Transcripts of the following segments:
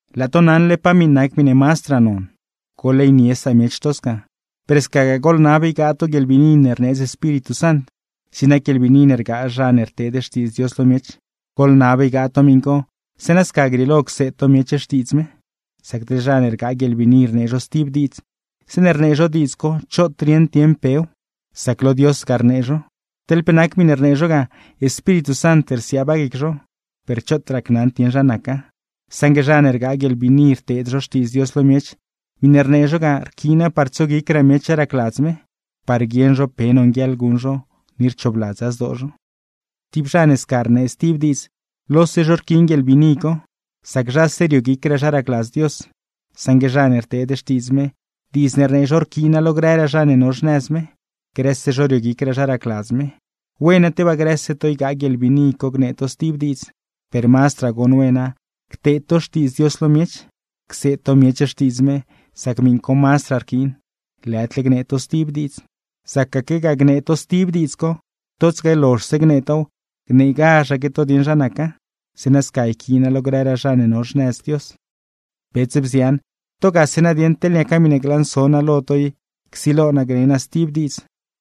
Laa to naṉle pa miṉ nac miṉe mazdraa non, ¡goḻleynie samiech to sca! Per scagaa goḻnab ygaa to guieḻbiini ne rneedz Espíritu Sant. Zig nac guieḻbiini ne rgaa zha ne rteed xtiidz Dios lo miech, goḻnab ygaa to miṉ co zeeṉa sca grieelo cseed to miech xtiidz me. Sac teḻ zha ne rgaa guieḻbiini rnee zho stib diidz, zeeṉe rnee zho diidz co choot rieṉd dieṉ pew, sac lo Dios ga rnee zho. Teḻ pe nac miṉe rnee zho ga, Espíritu Sant rsiaaba guic zho, per choot racnaṉd dieṉ zha naca. Saṉgue zha ne rgaa guieḻbiini rteed zho xtiidz Dios lo miech, miṉe rnee zho ga rquiina par tsoguicraa miech zha racladz me, par guieṉ zho pe nonguieḻ guṉ zho, ni rchoobladza zdoo zho. Tib zha ne sca rnee stib diidz, lose zho rquiin guieḻbiini co, sac zhase rioguicraa zha racladz Dios; saṉgue zha ne rteed xtiidz me, diidz ne rnee zho rquiina lo grëraa zha ne no xnëz me, grëse zho rioguicraa zha racladz me. Wena tebaa grëse to ygaa guieḻbiini co gnee to stib diidz, per mazdraa goṉ wena cteed to xtiidz Dios lo miech, cseed to miech xtiidz me; sac miṉ co mazdraa rquiin, lëdle gnee to stib diidz. Zacaquegaa gnee to stib diidz co, totsaque lozhse gnee tow, gneegazhaque to dieṉ zha naca; zeeṉa sca yquiina lo grëraa zha ne no xnëz Dios. Bets, bzian, to gase nadieṉ, teḻ niaca miṉe glanso naa lo to i csilo naa gne naa stib diidz,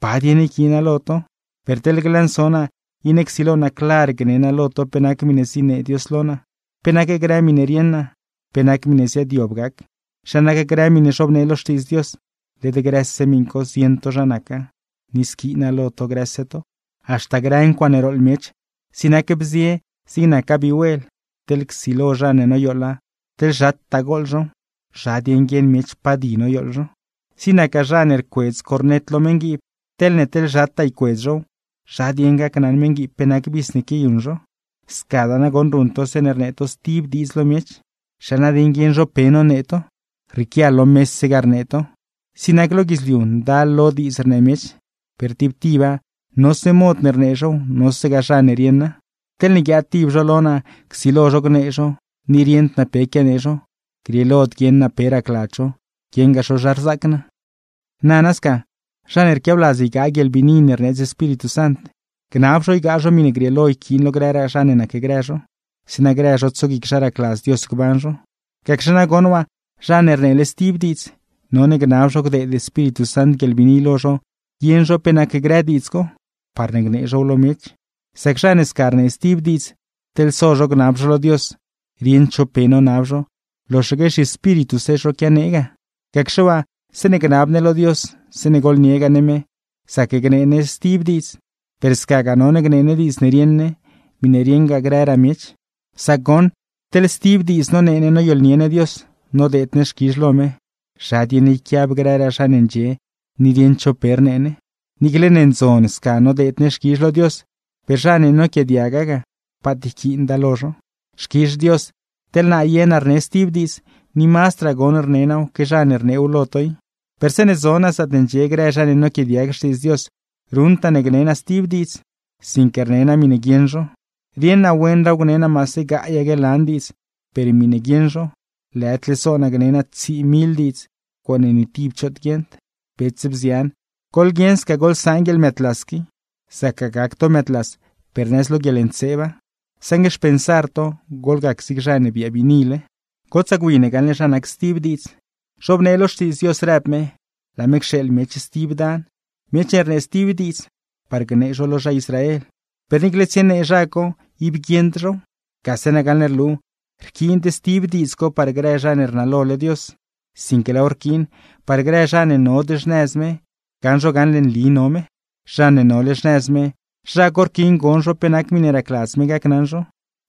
¿pa dieṉ yquiina lo to? Per teḻ glanso naa, iṉe csilo naa clar gne naa lo to pe nac miṉe zinee Dios lo naa, pe nac grë miṉe rieṉ naa, pe nac miṉe ziaadyob gac, zha nac grë miṉe zhobnee lo Xtiidz Dios, led grëse miṉ co zieṉ to zha naca, ni squiina lo to grëse to. Haxta grë ncuaaṉe rooḻ miech, zig nac bzie zig nacgaa vihuel, teḻ csilo zha ne noyooḻa teḻ zhataa gooḻ zhow, ¿zha dieṉ guieṉ miech pa di noyooḻ zho? Zig nacgaa zha ne rcuedz cornet lo meṉguiib, teḻne teḻ zhataa ycuedz zhow, ¿zha dieṉ gacnaṉ meṉguiib pe nac vis ne quiayuṉ zho? Scadaa nagoṉ ruṉ to zeeṉe rnee to stib diidz lo miech, ¿zha nadieṉ guieṉ zho pe nonee to? Rrieequia lo mese ga rnee to. Zig nac lo guidzliu ndal lo diidz rnee miech, per tib tiba nose mod ne rnee zhow, nose zha ne rieṉa. Teḻne guiaad tib zho lo naa csilo zho gnee zho, ni rieṉd naa pe quianee zho, grieelod guieṉ naa pe racladz zho, guieṉgaa zho zha rzaac naa. Nana sca, zha ne rquiabladz ygaa guieḻbiini ne rneedz Espíritu Sant, gnab zho ygaa zho miṉe grieelo yquiin lo grëraa zha ne nacgrë zho, zeeṉa grë zho tsoguic zha racladz Dios gban zho. Gacxe nagoṉ waa, zha ne rneele stib diidz, none gnab zho gdeed Espíritu Sant guieḻbiini lo zho guieṉ zho pe nac grë diidz co, parne gnee zhow lo miech; sac zha ne sca rnee stib diidz, teḻ so zho gnab zho lo Dios, rieṉd zho pe nonab zho, loxaque zhiespírituse zho quianee ga. Gacxe waa zeeṉe gnab ne lo Dios, zeeṉe gooḻniegaa ne me, zac gnee ne stib diidz, per scagaa none gnee ne diidz ne rieṉ ne, miṉe rieṉgaa grëraa miech. Sac goṉ teḻ stib diidz nonee ne noyooḻnie ne Dios, nodeed ne xquizh lo me, ¿zha dieṉ yquiab grëraa zha ne ndxie ni rieṉd zho pe rnee ne? Niicle ne ndzon sca nodeed ne xquizh lo Dios, per zha ne noquiaadiaga ga, paat yquiinda lo zho. Xquizh Dios, teḻ naa ye naa rne stib diidz, ni mazdraa goṉ rne naaw que zha ne rneew lo to i, per zeeṉe zo naa zaatne ndxie grë zha ne noquiaadiag Xtiidz Dios ruṉd naa ne gnee naa stib diidz, sinque rne naa miṉe guieṉ zho. Rieṉ naa wenraaw gne naa maase gaayaque lan diidz, per miṉe guieṉ zho, lëdle so naa gne naa tsii mil diidz, ncuaaṉe ni tib choot guieṉd. Bets, bzian, goḻguieṉ sca goḻsaan guieḻmëëdlas qui. Zacgaa gac to mëëdlas per nëz lo guieḻntseeba, saṉgue xpensar to goḻgac zig zha ne biaa biinile. Gotsaa gwi ne gaṉle zha nac stib diidz. Zhobnee lo Xtiidz Dios rëb me, laa me cxeeḻ miech stib dan miech ne rnee stib diidz, par gnee zho lo zha Israel; per niicle tsienee zha co, ib guieṉd zhow. Gase nagaṉle rlu rquiind stib diidz co par grë zha ne rnalole Dios, sinque laaw rquiin parne grë zha ne nod xnëz me gaṉ zho gaṉle nli no me. Zha ne nole xnëz me, zha co rquiin gon zho pe nac miṉe racladz me gacnaṉ zho,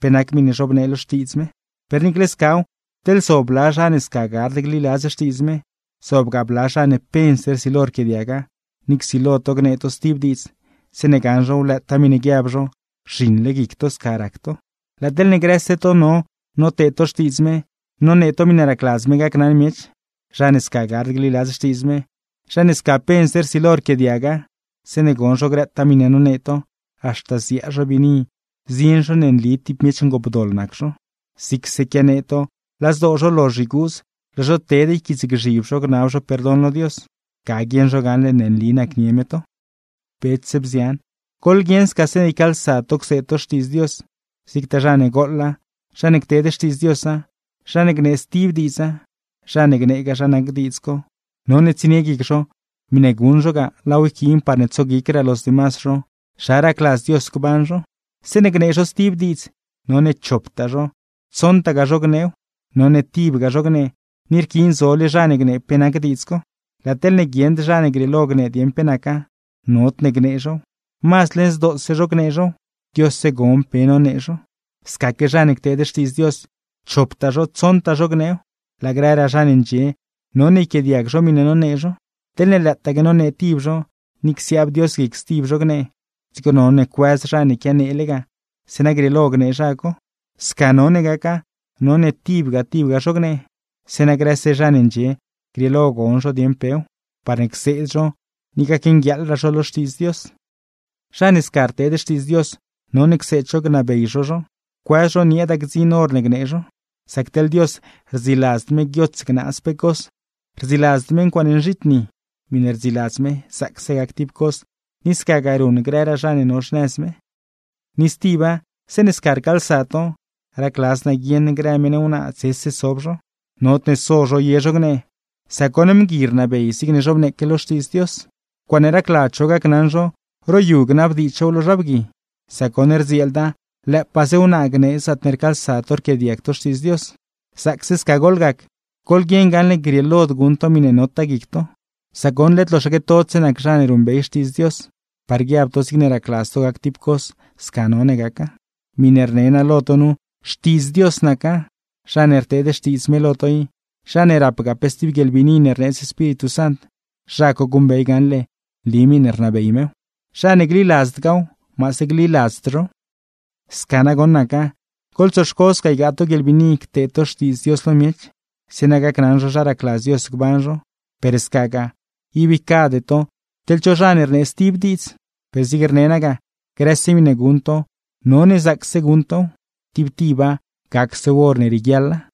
pe nac miṉe zhobnee lo Xtiidz me. Per niicle scaw, teḻne zob bla zha ne sca gard gliladz Xtiidz me, zobgaa bla zha ne pense rsilo rquiaadiaga, ni csilo to gnee to stib diidz, zeeṉe gaṉ zhow lëëtaa miṉe guiab zho rzhiṉle guic to sca rac to. Laa teḻne grëse to no noteed to xtiidz me, nonee to miṉe racladz me gacnaṉ miech, zha ne sca gard gliladz Xtiidz me, zha ne sca pense rsilo rquiaadiaga, zeeṉe gon zho grëtaa miṉe nonee to, haxta ziaa zho biini zieṉ zho ne nli tib miech ngoopdoḻ nac zho. Zigse quianee to laa zdoo zho lozh yguudz, laa zho ted yquiitsgzhib zho gnab zho perdon lo Dios; ga guieṉ zho gaṉle ne nli nacnie me to. Bets, bzian, goḻguieṉ sca zeeṉe ycaalsa to cseed to Xtiidz Dios, zigtaa zha ne gooḻa, zha ne cteed xtiidz Diosa, zha ne gnee stib diidza, zha ne gneegaa zha nac diidz co, none tsienie guic zho miṉe guṉ zho ga laaw yquiin parne tsoguicraa los demas zho zha racladz Dios gban zho. Zeeṉe gnee zho stib diidz, none choptaa zho, tsoṉtagaa zho gneew. None tibga zho gnee, ni rquiin zole zha ne gnee pe nac diidz co. Laa teḻne guieṉd zha ne grieelo gnee dieṉ pe naca, nodne gnee zhow; mazd leṉ zdoose zho gnee zhow, Diosse gon pe nonee zho. Scaque zha ne cteed xtiidz Dios, choptaa zho, tsoṉtagaa zho gneew, laa grëraa zha ne ndxie none yquiaadiag zho miṉe nonee zho. Teḻne lëëtaque nonee tib zho, ni csiaab Dios guic stib zho gnee, dzigo none cuëz zha ne quianeele ga zeeṉa grieelo gnee zha co. Sca none gaca, none tibga tibga zho gnee, zeeṉa grëse zha ne ndxie grieelo gon zho dieṉ pew, parne cseed zho, ni gacnguieeḻraa zho lo Xtiidz Dios. Zha ne sca rteed xtiidz Dios, none cseed zho gnabey zho zho, cuëz zho nieeda gdziṉ hor ne gnee zho. Sac teḻ Dios, rdziladzd me guiots gnaaz pe cos, rdziladzd me ncuaaṉe nzhiitni. Miṉe rdziladz me zaacse gac tib cos, ni scagaa ruṉ grëraa zha ne no xnëz me. Ni stiba, zeeṉe sca rcaalsa to, racladz naa guieṉ grë meṉ wnaa dzese sob zho. Nodne so zho ye zho gnee, sac goṉ mgui rnabey zigne zhobneeque lo Xtiidz Dios. Ncuaaṉe racladz zho gacnaṉ zho, ro yu ga gnabdiidz zhow lo zha bgui, sac goṉ, rdzieelda lëëpaaze wnaa gnee zaatne rcaalsa to rquiaadiag to Xtiidz Dios. Zaacse sca goḻgac, goḻguieṉ gaṉle grieelod guṉ to miṉe notaa guic to, sac goṉ led loxaque todse nac zha ne ruṉbey Xtiidz Dios, par guiab to zigne racladz to gac tib cos, sca none gaca. Miṉe rne naa lo to nu xtiidz Dios naca, zha ne rteed xtiidz me lo to i, zha ne rapgaa pe stib guieḻbiini ne rneedz Espíritu Sant, zha co guṉbey gaṉle nli miṉe rnabey mew. Zha ne gliladzdgaaw, maase gliladzd zhow. Sca nagoṉ naca. Goḻtsoxco sca ygaa to guieḻbiini cteed to xtiidz Dios lo miech, zeeṉa gacnaṉ zho zha racladz Dios gban zho; per scagaa, ib ycade to teḻ cho zha ne rnee stib diidz. Per zigne rne naa ga, grëse miṉe guṉ to none zaacse guṉ tow, tib tiba gacsew hor ne rieguiaḻa.